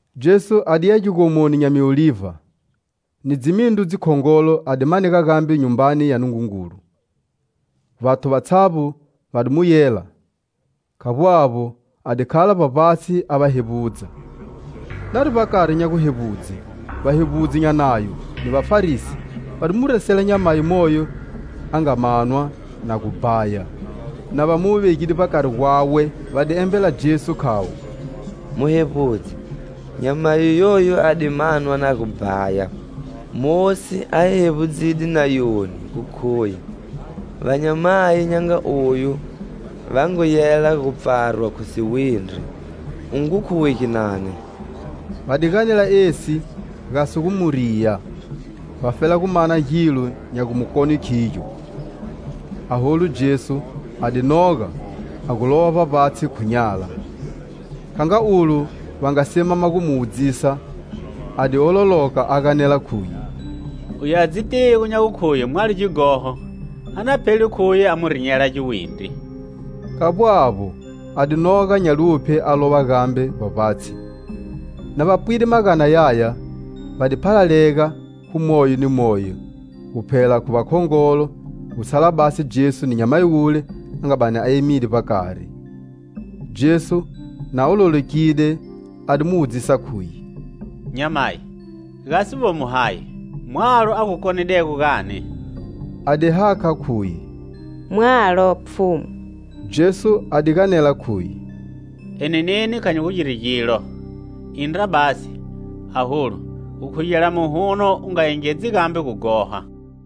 Jesu a diya Gigomoni nya Miolivha. Ni dzimindru dzikhongolo a di manega gambe Nyumbani ya Nungungulu. Vathu vatshavbo va di mu yela. Khavbo avbo, a di khala vbavbatshi a va hevbudza. Nari vbakari nya guhevbudze, vahevbudzi nya Nayo ni Vafarisi va di mu resela nyamayi moyo a nga manwa na gu bhaya. Na va mu vegide vbakari gwawe, va di embela Jesu, khavo: "Muhevbudzi, nyamayi yoyu a di manwa na gu bhaya. Mosi, a hi hevbudzide Nayoni gu khuye vanyamayi nya nga oyu va ngu yela gu pfarwa khu siwindri. U ngu khuwe ginani?" Va di ganela esi gasi gu mu riya, vafela gu mana gilo nya gu mu kone khigyo. Aholu Jesu a di noga, a gu lova vbavbatshi khu nyala. Kha nga ulo va nga simama gu mu wudzisa, a di ololoka, a ganela khuye: "Uye a dzitigo nya gukhuye mwalo gighoho, a na phele khuye a mu rinyela giwindri!" Khavbo avbo, a di noga nya luphye a lova gambe vbavbatshi. Na va pwide magana yaya, va di phalalega khu moyo ni moyo, gu phela khu vakhongolo, gu tshala basi Jesu ni nyamayi wule a nga bani a emide vbakari. Jesu, na ololokide, a di mu wudzisa, khuye: "Nyamayi, gasi vomo hayi? Mwalo a gu konidego gani?" A di hakha, khuye: "Mwalo, Pfhumu." Jesu a di ganela khuye: "Eni neni kha nyi gu giri gilo. Indra basi, aholu gu khugela muhuno u nga engedzi gambe gughoha."]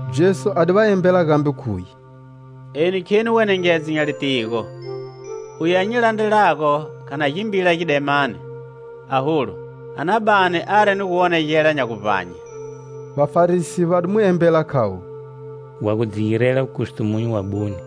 Jesu a di va embela gambe, khuye: "Eni kheni wenengedzo nya litigo. Uye a nyi landrelago kha na gimbila gidemani, aholu a na bani ari ni guwonegela nya guvbanye." Vafarisi va di mu embela, khavo: "Wa gu dzi girela wukustumunyu wabune.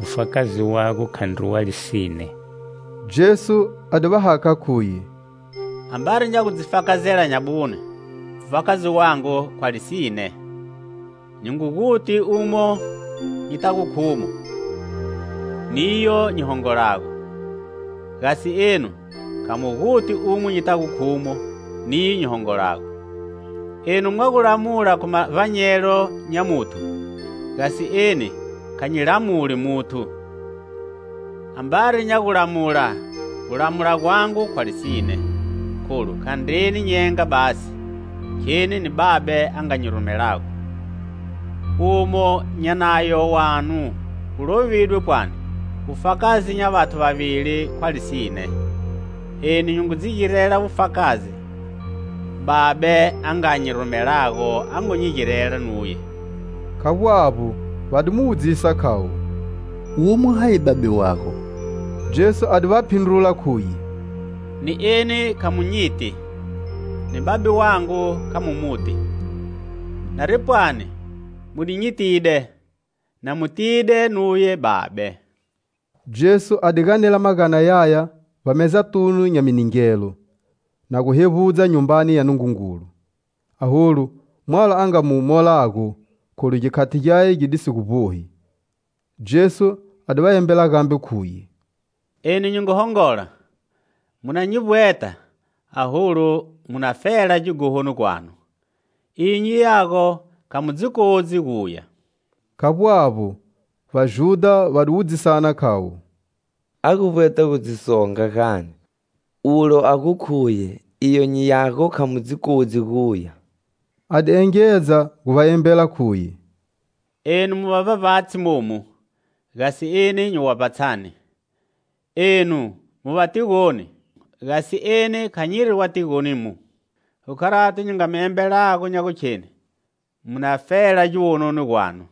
Wufakazi wago khandri wa lisine!" Jesu a di va hakha, khuye: "Ambari nya gu dzi fakazela nyabune, wufakazi wangu khwa lisine. Nyi ngu guti umo nyitago khumo niyo nyi hongolago! Gasi enu kha mu guti umo nyitago khumo, niyo nyi hongolago. Enu mwa gu lamula khu mavbanyelo nya muthu, gasi eni kha nyi lamuli muthu. Ambari nya gulamula, gulamula gwangu khwa lisine, kholu khandreni nyenga basi; kheni ni Babe a nga nyi rumelago. Umo nya Nayo wanu gu lovidwe pwani wufakazi nya vathu vavili khwa lisine. Eni nyi ngu dzi girela wufakazi; Babe, a nga nyi rumelago, a ngu nyi girela nuye." Khavbo avbo, va di mu wudzisa, khavo: "Womo hayi Babe wago?" Jesu a di va phindrula, khuye: "Ni eni kha mu nyiti, ni Babe wangu kha mu muti. Nari pwani mu di nyitide, na mutide nuye Babe." Jesu a di ganela magana yaya vbamezatunu nya miningelo, na gu hevbudza Nyumbani ya Nungungulu. Aholu, mwalo a nga mu molago, kholu gikhati gyaye gi di si gu vbohi. Jesu a di va embela gambe, khuye: "Eni nyi ngu hongola, mu na nyi vbweta, aholu mu na fela gighohoni gwanu. Iyo nyiyago kha mu dzi kodzi guya." Khavbo avbo, Vajudha va di wudzisana, khayo: "A gu vbweta gu dzi songa gani, ulo a gu khuye: 'Iyo nyiyago kha mu dzi kodzi guya!' " A di engedza gu va embela, khuye: "Enu mu va vbavbatshi momu; gasi eni nyi wa vbatshani; enu mu va tigoni, gasi eni kha nyiri wa tigonimu. Khu kharato nyi nga mi embelago nya gukheni mu na fela giwononi gwanu,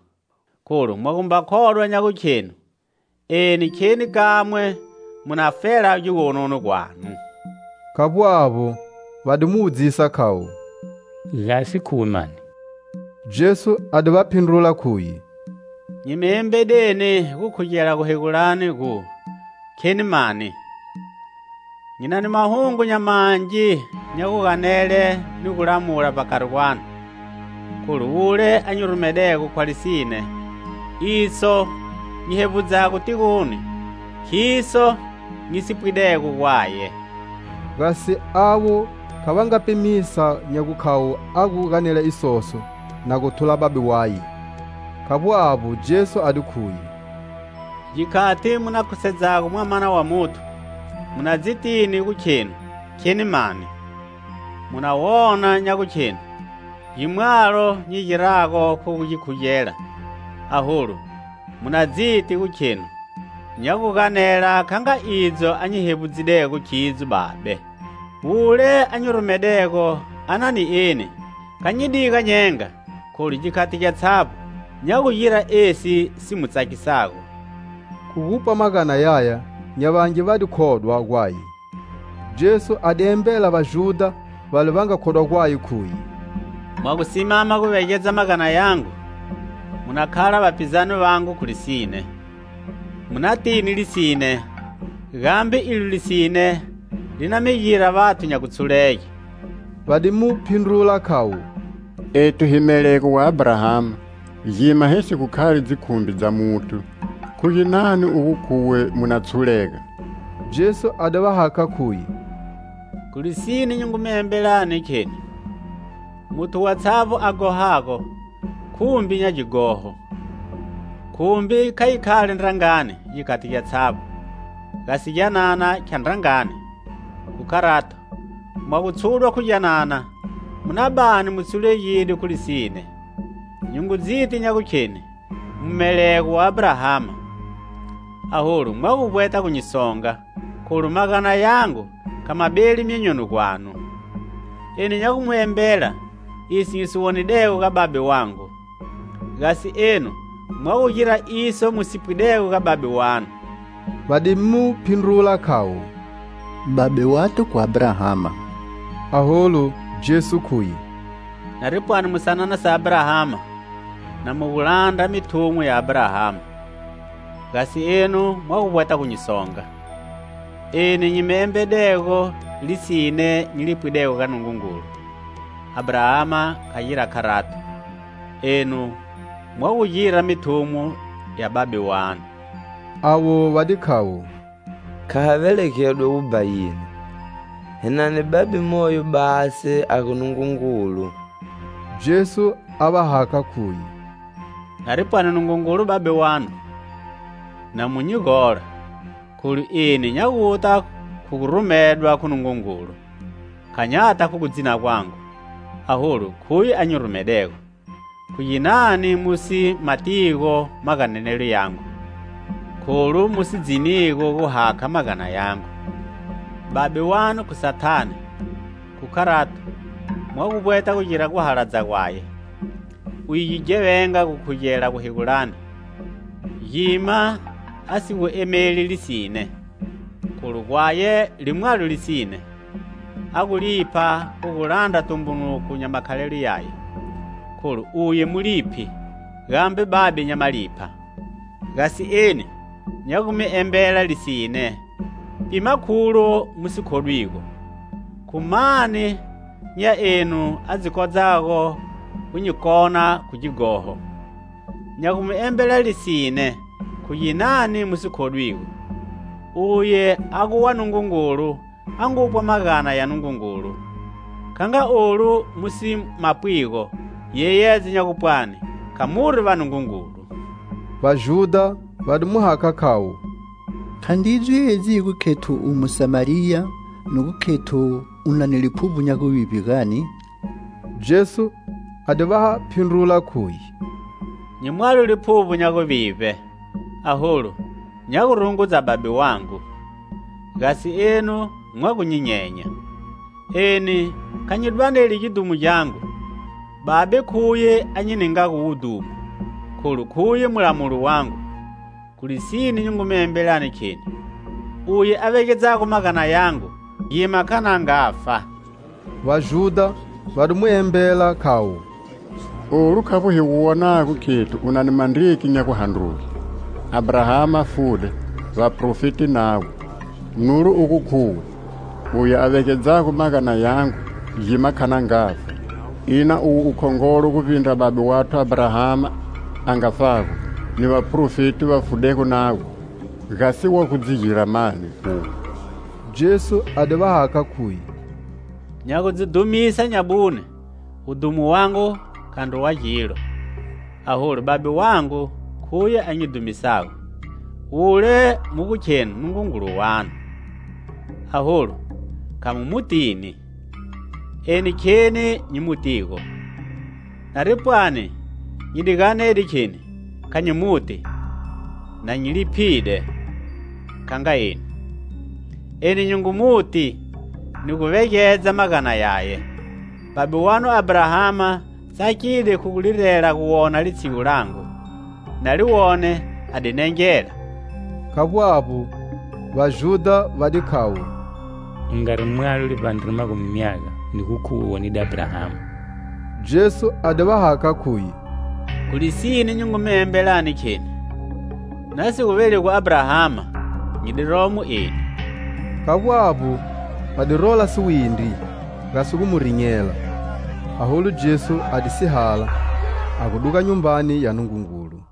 kholu mwa gumba khodwa nya gukhenu eni kheni kamwe, mu na fela giwononi gwanu." Khavbo avbo, va di mu wudzisa, khavo: "Gasi khuwe mani?" Jesu a di va phindrula khuye: "Nyi mi embedeni gu khugela guhegulani gu: kheni mani! Nyi na ni mahungu nya mangi nya guganele ni gulamula vbakari gwanu. Kholu wule a nyi rumedego khwa lisine. Iso nyi hevbudzago tigoni khiso nyi si pwidego gwaye." Gasi avo kha va nga pimisa nya gukhavo a gu ganela isoso na gu thula Babe waye. Khavbo avbo, Jesu a di khuye: "Gikhati mu na khusedzago Mwamana wa Muthu, mu na dzitini gu khenu kheni mani. Mu na wona nya gukhenu gimwalo nyi girago khu gu gi khugela, aholu mu na dziti gu khenu nya gu ganela kha nga idzo a nyi hevbudzidego khidzo Babe. Wule a nyi rumedego anani eni; kha nyi diga nyenga, kholu gikhati gyatshavbo nya gu gira esi si mu tsakisago." Khu gupwa magana yaya, nya vangi va di khodwa gwaye. Jesu a di embela Vajudha vale va nga khodwa gwaye, khuye: "Mwa gu simama guvegedza magana yangu, mu na khala vapizane vangu khu lisine, mu natini lisine, gambe ilo lisine li na mi gira vathu nya gutshulege." Va di mu phindrula, khavo: "Ethu hi melego wa Abrahama, gima hi si gu khali dzikhumbi dza muthu, khu ginani ugu khuwe mu na tshulega?" Jesu a di va hakha, khuye: "Khu lisine, nyi ngu mi embelani kheni: muthu watshavbo a ghohago, khumbi nya gighoho. Khumbi kha yi khali ndrangani gikhati gyatshavbo, gasi gyanana khya ndrangani. Khu kharato, mwa gu tshudwa khu gyanana, mu na bani mu tshulegide khu lisine. Nyi ngu dziti nya gukheni mu melego wa Abrahama, aholu mwa gu vbweta gu nyi songa, kholu magana yangu kha ma beli myonyoni gwanu. Eni nya gu mi embela iso nyi si wonidego ga Babe wangu; gasi enu mwa gu gira iso mu si pwidego ga babe wanu." Va di mu phindrula, khavo; "Babe wathu khu Abrahama!" Aholu, Jesu khuye: "Nari pwani mu sanana sa Abrahama na mu gu landra mithumo ya Abrahama. Gasi enu mwa gu vbweta gu nyi songa, eni nyi mi embedego lisine nyi li pwidego ga Nungungulu. Abrahama kha gira kharato! Enu mwa gu gira mithumo ya babe wanu." Avo va di khavo: "Kha ha velegedwa wubhayini. Hi na ni Babe moyo basi a gu, Nungungulu." Jesu ava hakha khuye: "Nari pwani Nungungulu Babe wanu, na mu nyi gola, kholu eni nya guta khu gu rumedwa khu Nungungulu. Kha nyata khu gudzina gwangu, aholu khuye a nyi rumedego. Khu ginani mu si ma tigo maganelelo yangu? Kholu mu si dzinigo gu hakha magana yangu! Babe wanu khu Sathane, khu kharato mwa vbweta gugira guhaladza gwaye. Uye gighevenga gukhugela guhegulani, gima a si gu emeli lisine, kholu gwaye limwalo lisine. A gu lipha khu gu landra tumbunuko nya makhalelo yaye, kholu uye muliphi gambe babe nya malipha. Gasi eni nya gu mi embela lisine, pima kholu mu si khodwigo. Khu mani nya enu a dzi kodzago gu nyi kona khu gighoho? Nya gu mi embela lisine, khu ginani mu si khodwigo? Uye a gu wa Nungungulu a ngupwa magana ya Nungungulu; kha nga olu mu si mapwigo, giyeyedzo nya gupwani kha muri va Nungungulu." Vajudha va di mu hakha, khayo: "Khandridzo edzi hi gu khethu u Musamariya, ni gu khethu u na mi liphuvbo nya guvivbe, gani?" Jesu a di va phindrula, khuye: "Nyi mwalo liphuvbo nya guvivbe, aholu nya gu rungudza Babe wangu; gasi enu mwa gu nyi nyenya. Eni kha nyi dwaneli gidhumo gyangu, Babe khuye a nyi ningago wudhumo, kholu khuye mulamuli wangu. Khu lisine, nyi ngu mi embelani, kheni: uye a vegedzago magana yangu, gima kha na ngafa." Vajudha va di mu embela khayo. "Olu khavbo hi gu wonago khethu u na ni mandriki nya guhandruge. Abrahama fude, vaprofeti navo; nulo u gu khuwe: 'Uye a vegedzago magana yangu gima kha na ngafa.' Ina uwe u khongolo guvbindra babe wathu Abrahama, a ngafago? Ni vaprofeti va fudego navo? Gasi wa gu dzi gira mani uwe?" Jesu a di va hakha, khuye: "Nya gu dzi dhumisa nyabune, wudhumo wangu khandri wa gilo. Aholu Babe wangu khuye a nyi dhumisago, wule mu gu khenu Nungungulu wanu. Aholu, kha mu mutini; eni kheni nyi mu tigo. Nari pwani nyi di ganede kheni kha nyi mu ti, na nyi liphide kha nga enu. Eni nyi ngu mu ti ni guvegedza magana yaye. Babe wanu Abrahama tsakide khu gulirela guwona litshigu langu; na li wone a di nengela" Khavbo avbo, Vajudha va di khayo: "U ngari mwalo livbandre magumi myaga, ni gu khuwe u wonide Abrahama?" Jesu a di va hakha, khuye: "Khu lisine, nyi ngu mi embelani kheni: na si gu velegwi Abrahama, nyi di romo eni." Khavbo avbo, va di rola siwindri gasi gu mu rinyela, aholu Jesu a di sihala, a gu duga Nyumbani ya Nungungulu.